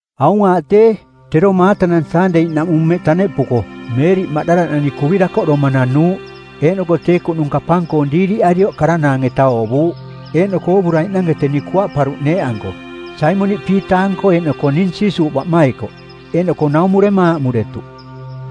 Aung aaꞌ tee, tero maatanang Saandei-naꞌmung mmeꞌ taneꞌpuko, Meeriꞌ Maꞌdala-nani kuvi dakoꞌdoma nanuuꞌ, eeꞌnoko tee kuꞌnung kapang-koong diiriꞌarioꞌ karanaang-eta oovuuꞌ. Eeꞌnoko oovuraiꞌnange teni kuaꞌparuꞌ neeꞌanko, Saimoniꞌ Piita-anko eeꞌnoko ning Jiisuuꞌ baꞌmaikoꞌ. Eeꞌnoko naumurema aaꞌmuretuꞌ,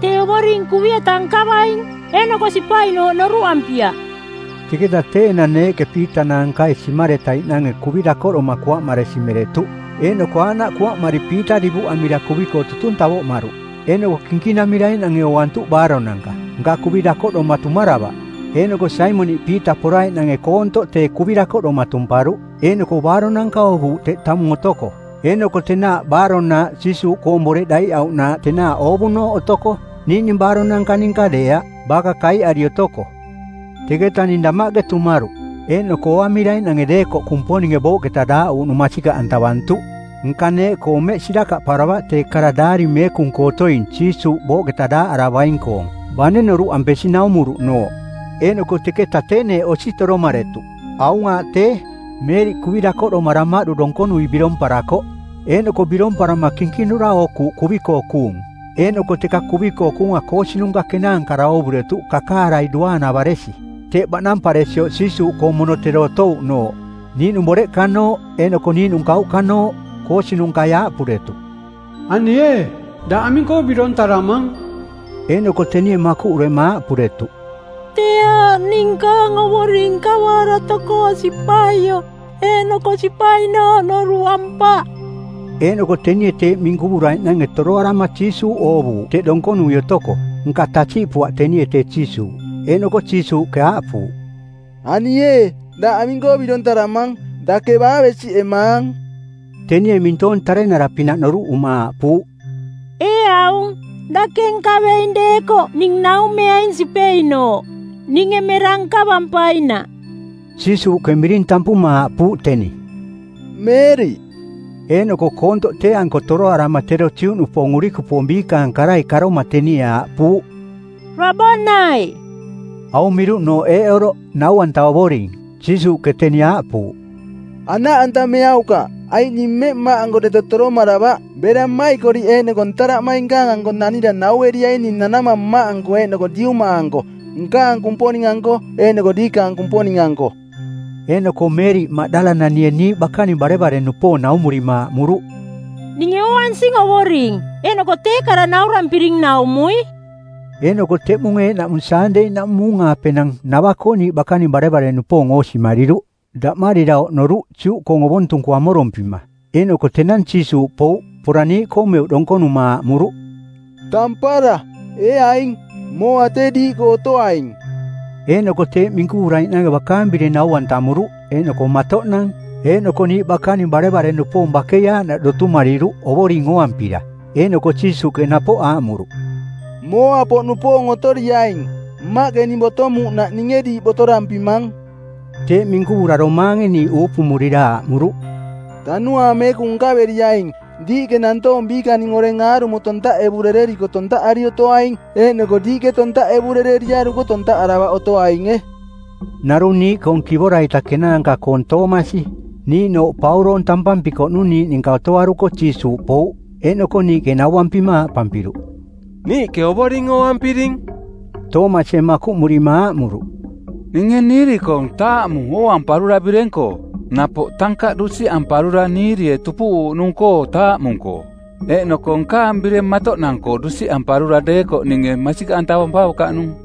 “Tee Ovoring kuvi-eta nkavaing. Eeꞌnoko sipainooꞌ noruꞌampiaꞌ.” Teketa tee enang neeꞌke Piita naankai simaretaiꞌnange kuvi dakoꞌdoma kuaꞌmaresi meretuꞌ; Eeꞌnoko aaꞌnaꞌ kuaꞌmari Piita divuꞌamira kuvi-koo tutung tavoꞌmaruꞌ. Eeꞌnoko kinkinamiraiꞌnange ooantuꞌ baaronanka. Nka kuvi dakoꞌdoma tumaravaꞌ. Eeꞌnoko Saimoniꞌ Piita poraiꞌnange koontoꞌ tee kuvi dakoꞌdoma tumparuꞌ, eeꞌnoko baaronanka oovuuꞌ teꞌ tamung otoko. Eeꞌnoko tenaaꞌ baarong-nanaaꞌ Jiisuuꞌkoong boreꞌ daiꞌauꞌnanaaꞌ, tenaaꞌ oovunooꞌ otoko, niiꞌning baaronanka ninka deeaꞌ, baka kaiꞌari otoko. Teketa ning damaꞌke tumaruꞌ, eeꞌnoko ooamiraiꞌnange deekoꞌ Kumponinge booꞌketa daaꞌuuꞌnung masikaꞌantavantuꞌ. Nka neeꞌkoo mmeꞌ sirakaꞌparavaꞌ tee kara Daari Meekung-koo otoing Jiisuuꞌ booꞌketa daaꞌaravaing-koong, bane noruꞌampesi naumuruꞌnooꞌ. Eeꞌnoko teketa tee neeꞌ osi toromaretuꞌ. Aung aaꞌ tee, Meeriꞌ kuvi dakoꞌdoma damaꞌdu donkonui biromparakoꞌ, eeꞌnoko biromparama kinkinura ookuuꞌ kuvi-koo kuung. Eeꞌnoko teka kuvi-koo kuunga koosinunka kenaankara oovuretuꞌ kakaarai duaanavaresi, teꞌ baꞌnamparesioꞌ Jiisuuꞌkoong mono tero otouꞌnooꞌ, niiꞌnung boreꞌkanooꞌ eeꞌnoko niiꞌnung kauꞌkanooꞌ. Koosinungkai˜ aaꞌpuretuꞌ, “Ani ee, daꞌ aming-koo birontaramang?” Eeꞌnoko tenie makuꞌurema aaꞌpuretuꞌ, “Tee aaꞌ ning nkaang Ovoring nkavaara tokoo sipaioꞌ, eeꞌnoko sipainooꞌ noruꞌampaꞌ.” Eeꞌnoko tenie teeꞌ minkuvuraiꞌnange torotoroarama Jiisuuꞌ oovuuꞌ teꞌ donkonui otoko, nka tasiꞌpuaꞌ tenie tee Jiisuuꞌ. Eeꞌnoko Jiisuuꞌke aaꞌpuuꞌ, “Ani ee, daꞌ aming-koo birontaramang? Dake baa besiꞌemaang?” Tenie mintoong tarenara-pinaꞌ noruꞌuma aaꞌpuuꞌ, “Ee aung, dake nkaveing deekoꞌ ning naumeaing sipeinooꞌ, ninge mera nkavampainaꞌ.” Jiisuuꞌke miring tampuma aaꞌpuuꞌ teni, “Meeriꞌ.” Eeꞌnoko koontoꞌ tee-anko toroarama tero Juꞌnupoong urikupoong biikaang karai karoma tenie aaꞌpuuꞌ, “Rabonai.” Aung miruꞌnooꞌ eeꞌ oroꞌ, Nau-anta Ovoring. Jiisuuꞌke teni aaꞌpuuꞌ, “Anaꞌantameaukaꞌ, aiꞌ ning mmeꞌ Mmaꞌanko deto toromaravaꞌ. Bera mmaikoriꞌ eeꞌnoko ntaraꞌmainkaang-anko nanira naueriaing ning nanamang Mmaꞌanko eeꞌnoko diuma-anko, nkaang Kumponing-anko eeꞌnoko diikaang Kumponing-anko.” Eeꞌnoko Meeriꞌ Maꞌdala-nanie niiꞌ bakaning barevare-nupoong naumurima aaꞌmuruꞌ, “Ninge ooansing Ovoring, eeꞌnoko tee kara naurampiring naumui.” Eeꞌnoko teꞌmung eeꞌnaꞌmung Saandei-naꞌmung muung-aapenang nava-koo niiꞌ bakaning barevare-nupoong oosimariruꞌ. Daꞌmarira oꞌnoruꞌ Juꞌkoong ovontung-koo amorompima. Eeꞌnoko tenang Jiisuuꞌ pouꞌ. Pora niiꞌkoo meuꞌ donkonuma aaꞌmuruꞌ, “Tampara, ee aing! Mooa tee diiꞌkoo otoaing!” Eeꞌnoko teeꞌ minkuvuraiꞌnange bakaang bireng nau-antamuruꞌ eeꞌnoko mantoꞌnang. Eeꞌnoko niiꞌ bakaning barevare-nupoong bakei aaꞌnaꞌ dotumariruꞌ Ovoring ooampira. Eeꞌnoko Jiisuuꞌke napoꞌ aaꞌmuruꞌ, “Mooa-poꞌnupoong otoriaing. Mmaꞌke ning botomuuꞌnaꞌ ninge diiꞌ botorampimang.” Teeꞌ minkuvura domaange niiꞌ uupumurira aaꞌmuruꞌ, “Tanuaang Meekung nkaveriaing. Diiꞌke nantoong biikaning oreng aarumo tontaꞌevurereriko tontaꞌari otoaing, eeꞌnoko diiꞌke tontaꞌevurereriaruko tontaꞌaravaꞌ otoainge.” Narung niiꞌkoong Kivora-ita Kenaanka-koong Toomasi, niiꞌnooꞌ Pauroong tampampikoꞌnung niiꞌ ninka otoaruko Jiisuuꞌ pouꞌ. Eeꞌnoko niiꞌke nauampima aaꞌpampiruꞌ, “Niiꞌke Ovoring ooampiring.” Toomasie makuꞌmurima aaꞌmuruꞌ, “Ninge niiri-koong taamu ooamparura bireng-koo, napoꞌ tankaꞌ dusiꞌamparura niirie tupuꞌuuꞌnung-koo taamu-koo, eeꞌnoko nkaang bireng matoꞌnang-koo dusiꞌamparura deekoꞌ ninge masikaꞌantavampaukaꞌnung.”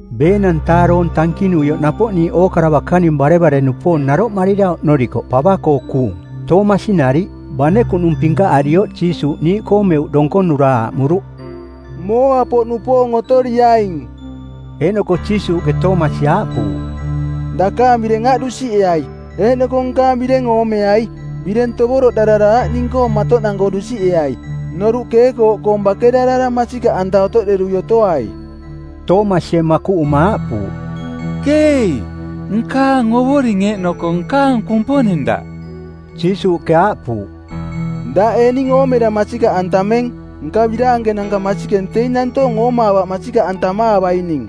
˜Beenang-taa doong tankinuioꞌ napoꞌ niiꞌ ookara bakaning barevare-nupoong naroꞌmarira oꞌnorikoꞌ pava-koo kuung, Toomasi nariꞌ. Bane kuꞌnung pinkaꞌarioꞌ Jiisuuꞌ niiꞌkoo meuꞌ donkonura aaꞌmuruꞌ, “Mooa-poꞌnupoong otoriaing!” Eeꞌnoko Jiisuuꞌke Toomasi aaꞌpuuꞌ, “Dakaang bireng aꞌ dusiꞌeai, eeꞌnoko nkaang bireng oomeai. Bireng tovoroꞌdarara aꞌ ning-koo mantoꞌnang-koo dusiꞌeai. Noruꞌ keekooꞌkoong bakerarara masikaꞌanta otoꞌderui otoai.” Toomasie makuꞌuma aaꞌpuuꞌ, “Keei, nkaang Ovoring eeꞌnoko nkaang Kumponing Daꞌ!” Jiisuuꞌke aaꞌpuuꞌ, “Daꞌ ee ning oomera masikaꞌantameng? Nka biraankenanka masikeng teing nantoong oomaavaꞌ masikaꞌantamaavaining.”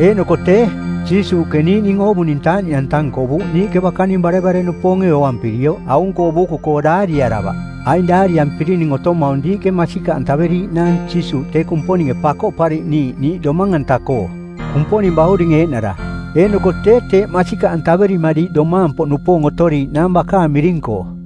Eeꞌnoko tee, Jiisuuꞌke niiꞌning oovuning taaꞌniꞌanta nkovuuꞌ niiꞌke bakaning barevare-nupoonge ooampirioꞌ aung-koo buuku-koo daariaravaꞌ. Aing daariampirining otomaung diiꞌke masikaꞌantaveriiꞌnaang Jiisuuꞌ tee Kumponinge Pakoꞌpariꞌniiꞌ niiꞌ domang-anta-koo, Kumponing Bauring eeꞌnara. Eeꞌnoko tee, teeꞌ masikaꞌantaverima diiꞌ domaang-poꞌnupoong otoriiꞌnaang bakaang miring-koo.